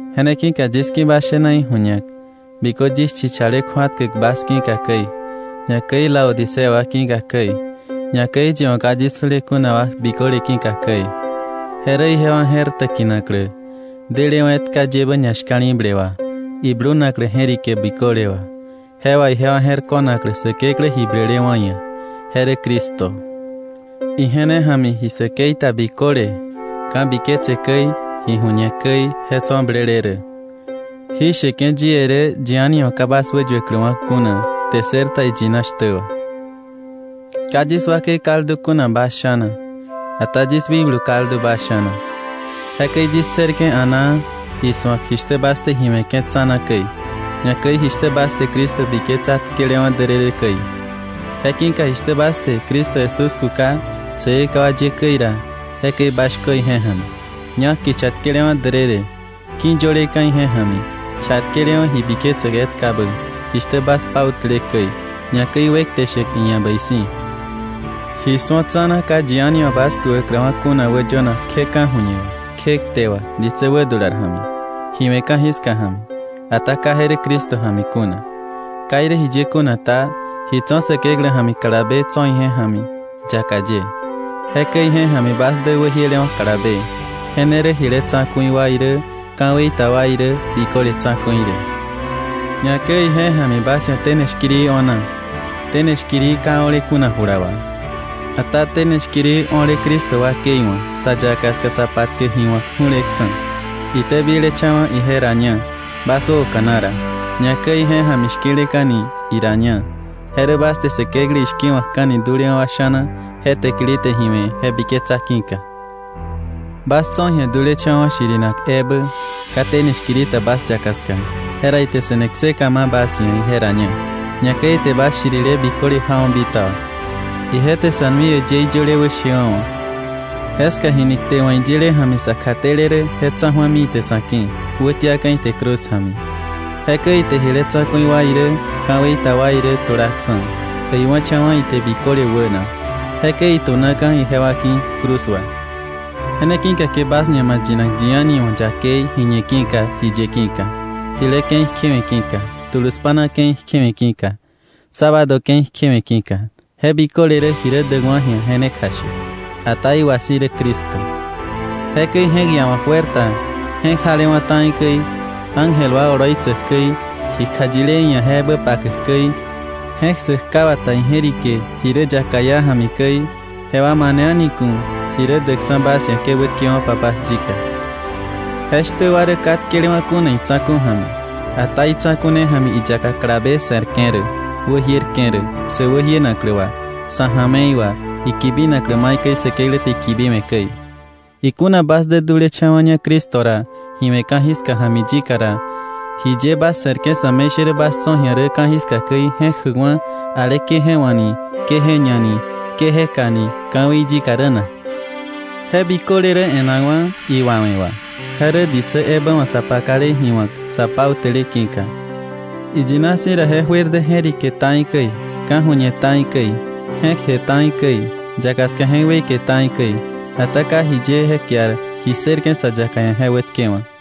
Je ne ki̱ka yis ki̱ bas shena iju̱ñak bikö yis chichale kju̱atkäk bas ki̱ka käi, ñakäi Laodicea wa ki̱ka käi, ñakäi yi wa̱ ka yis su̱le kuna wa biköle ki̱ka käi. Je rä ijewa je̱r täkinaklä, delewa̱ etka yebä ñashka̱li̱ble wà, iblunaklä je̱rike biköle wà, je wà ijewa je̱r ko̱naklä Säkeklä ji blelewa̱ ia̱, je rä Cristo. Ije ne ja̱mi ji säkei ta biköle, ka̱biketse käi, ji ju̱ñe käi je tso̱ blele rä. Jí sheke̱ yie rä yi a̱ni wa̱ ka bas wäyuäkläwa̱ kuna kte ssër ta iyina shtä wà. Ka yis wakei kaldu kuna bas sha̱na, ata yis wikblu kaldu bas sha̱na. Jekäi yis ssërke̱ a̱naa isu̱ak jishtä bas te ji we̱ke̱ tsa̱na käi, ñakäi jishtä bas te Cristo biketsa tkelewa̱ därërë käi. Je ki̱ka jishtä bas te Cristo Jesús kuka Säkekewa ye käi ra, jekäi bas shkö ije ja̱mi, ñak kicha tkelewa̱ därërë, ki̱yöleka̱ ije ja̱mi, chatkelewa̱ ji biketsäk etkabä, jishtä bas pautäle käi, ñakäi wekte shäk iia̱ bäi si̱. Ji su̱o tsa̱na ka yi a̱ni wa̱ bas kukakläwa̱ kuna wäyönak kje ka̱ju̱ñe wà, kje kte wà ditsä wädular ja̱mi, ji we̱ ka̱jiska ja̱mi, ata ka je rä Cristo ja̱mi kuna. Ka irä jiye kuna ta, ji tso̱ Säkeklä ja̱mi kalabe tso̱ ije ja̱mi yaka ye. Jekäi ije ja̱mi bas dä wäjielewa̱ kalabe, je ne rä jile tsa̱ku̱i wa irä, ka̱wei ta wa irä, biköle tsa̱ku̱i rä. Ñakäi ije ja̱mi bas ia̱ tene shkiri o̱na, tene shkiri ka o̱le kuna jula wà, ata tene shkiri o̱le Cristo wakei wa̱, sa yaka ska sa patkäk ji wa̱k ju̱leksa̱. itäbilecha̱wa̱ ije raña bas wäoka̱na ra, ñakäi ije ja̱mi shki̱leka̱ni iraña, je rä bas te Säkeklä ishki̱wa̱kka̱ni dulewa̱ wa sha̱na je täkili te ji we̱ je biketsa ki̱ka. Bas tso̱ ji̱a dulecha̱wa̱ shirinak ebä, ka tene shkiri ta bas yaka ska, jera ite se̱ne kseka ma̱ bas ia̱ ije raña, ñakäi ite bas shirile biköle jawa̱ bitaba. Ije te sa̱ nui äyëí yöle wäshewa̱wa̱, jeska jini kte wa̱ iyile ja̱mi sa kjatele rä, je tsa̱ju̱ami ite sa̱ ki̱, wätiaka̱ ite cruz ja̱mi. Jekäi ite jile tsa̱ku̱i wa irä ka̱wei ta wa irä tulaksa̱, äiwa̱cha̱wa̱ ite biköle wäna. Jekäi itu̱naka̱ ijewa ki̱ cruz wà. Je ne ki̱ka ke bas ñama̱ yinak yi a̱ni wa̱ yakei ji ñe ki̱ka, ji ye ki̱ka, jile ke̱i kjewe̱ ki̱ka, tulu spa̱na ke̱i kjewe̱ ki̱ka, sábado ke̱i kjewe̱ ki̱ka. Je biköle rä ji rä däkwa̱ ji̱a je ne kjashäk, ata iwa si̱ rä Cristo. Jekäi je̱k iawa̱k juer ta je̱k jalewa̱ ta̱i käi, ángel wa oloitsäk käi, ji kjayile iia̱ je ebä pakäk käi, je̱k ssäk ka wata ije̱rike ji rä yaka iá ja̱mi käi, jewa mane a̱ni ku̱ ji rä däkksa̱ bas ia̱ ke wätkewo̱pa bas yika. Jeshtä wa rä ka tkelewa̱ kuna itsa̱ku̱ ja̱mi. Ata itsa̱ku̱ ne ja̱mi iyaka kalabe se̱rke̱ rä, wäjierke̱ rä, sä wäjienaklä wà, sa̱ ja̱me̱i wà, ikibinaklä maikäi Säkeklä te ikibiwe̱ käi. Ikuna bas dä dulecha̱wa̱ña Cristo ra ji we̱ ka̱jiska ja̱mi yika ra, ¿jiye bas se̱rke̱ sa̱me̱ishärä bas tso̱ ji̱a rä ka̱jiska käi, je̱k jäkwa̱ ale ke je wá̱ ni, ke je ña ni, ke je ka ni ka̱wei yika rä na? Je biköle rä e̱nakwa̱ iwawe̱ wà, je rä ditsä ebä wa̱ sa pakale ji wa̱k, sa pautäle ki̱ka. Iyina si̱ ra je juer dä je̱rike ta̱i käi, ka̱ju̱ñe ta̱i käi, je̱kje ta̱i käi, yaka ska je̱k weike ta̱i käi. Ata ka jiye je kiar ji ssërke̱ sa yaka ia̱ je wätkewa̱k.